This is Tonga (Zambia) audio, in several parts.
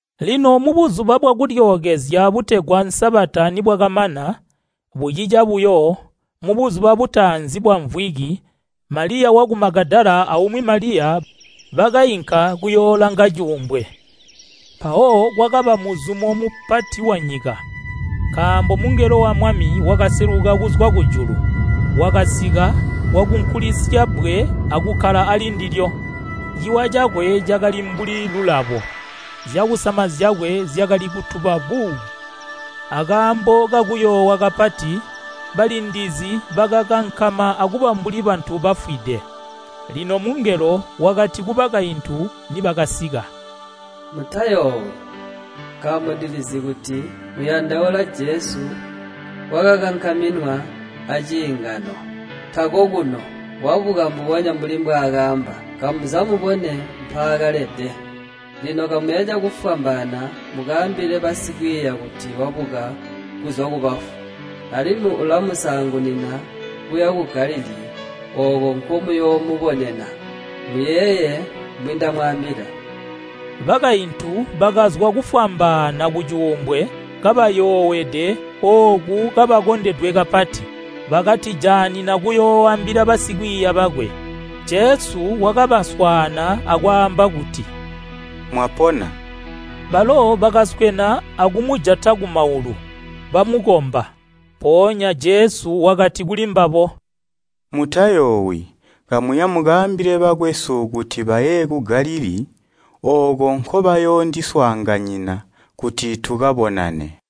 Lino Buzuba bwa Kulyookezya butegwa Sabata nibwakamana, bucica buyo, mubuzuba butaanzi bwamvwiki Maliya waku Magadala aumwi Maliya bakainka kuyoolanga cuumbwe. Mpawo kwakaba muzumo mupati wanyika, nkaambo mungelo wa Mwami wakaseluka kuzwa kujulu, wakasika wakunkulisya bbwe akukkala ali ndilyo. Ciwa cakwe cakali mbuli lulabo, zyakusama zyakwe zyakali kutuba buu. Akaambo kakuyoowa kapati, balindizi bakakankama akuba mbuli bantu bafwide. Lino mungelo wakati kubakaintu nibakasika, “Mutayoowi, nkaambo ndilizi kuti muyandaula Jesu wakakankaminwa aciingano. Tako kuno, wabuka mbubonya mbuli mbwaakaamba. Kamuza mubone mpaakalede. Lino kamuya cakufwambaana mukaambile basikwiiya kuti wabuka kuzwa kubafu, alimwi ulamusaangunina kuya ku Galilii ooko nkomuyoomubonena. Muyeeye mbwindamwaambila” Bakaintu bakazwa kufwambaana kucuumbwe kabayoowede ooku kabakondedwe kapati! Bakatijaanina kuyooambila basikwiiya bakwe. Jesu wakabaswaana akwaamba kuti, “Mwapona.” Balo bakaswena akumujata kumaulu, bamukomba. Mpoonya Jesu wakati kulimbabo, “Mutayoowi, kamuya mukaambile bakwesu kuti baye ku Galilii ooko nkobayoondiswaanganyina kuti tukabonane.”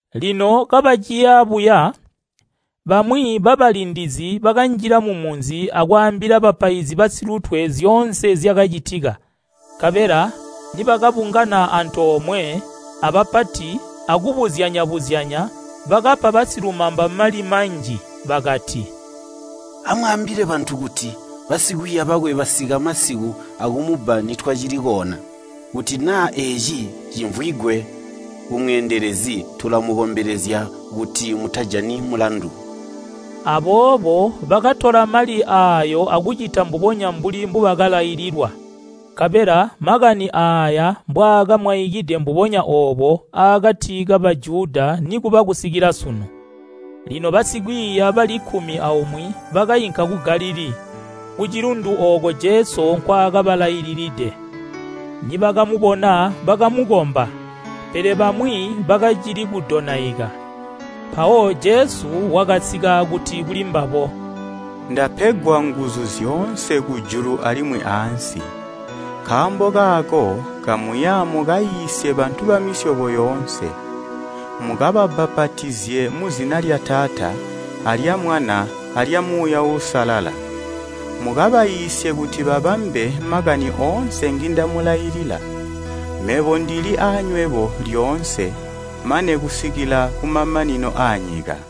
Lino kabaciya buya, bamwi babalindizi bakanjila mumunzi akwaambila bapaizi basilutwe nzyoonse zyakacitika. Nkabela nibakabungana antoomwe abapati akubuzyanya-buzyanya, bakapa basilumamba mali manji, bakati, “Amwaambile bantu kuti, ‘Basikwiiya bakwe basika masiku akumubba nitwacili koona.’ Kuti naa eeci cimvwigwe kumweendelezi tulamukombelezya kuti mutajani mulandu.” Aboobo bakatola mali aayo akucita mbubonya mbuli mbubakalaililwa. Nkabela makani aaya mbwaamwaikide mbubonya oobo aakati ka Bujuda nikuba kusikila sunu. Lino basikwiiya bali kkumi aumwi bakainka ku Galilii, kucilundu ooko Jesu nkwaakabalaililide. Nibakamubona bakamukomba, pele bamwi bakacili kudonaika. Mpawo Jesu wakasika akuti kulimbabo, “Ndapegwa nguzu zyoonse kujulu alimwi aansi. Nkaambo kaako kamuya mukaiisye bantu bamisyobo yoonse, mukababbapatizye muzina lya Taata alya Mwana alya Muuya Uusalala. Mukabaiisye kuti babambe makani oonse ngindamulailila. Mebo ndili aanywebo lyoonse, mane kusikila kumamanino aanyika.”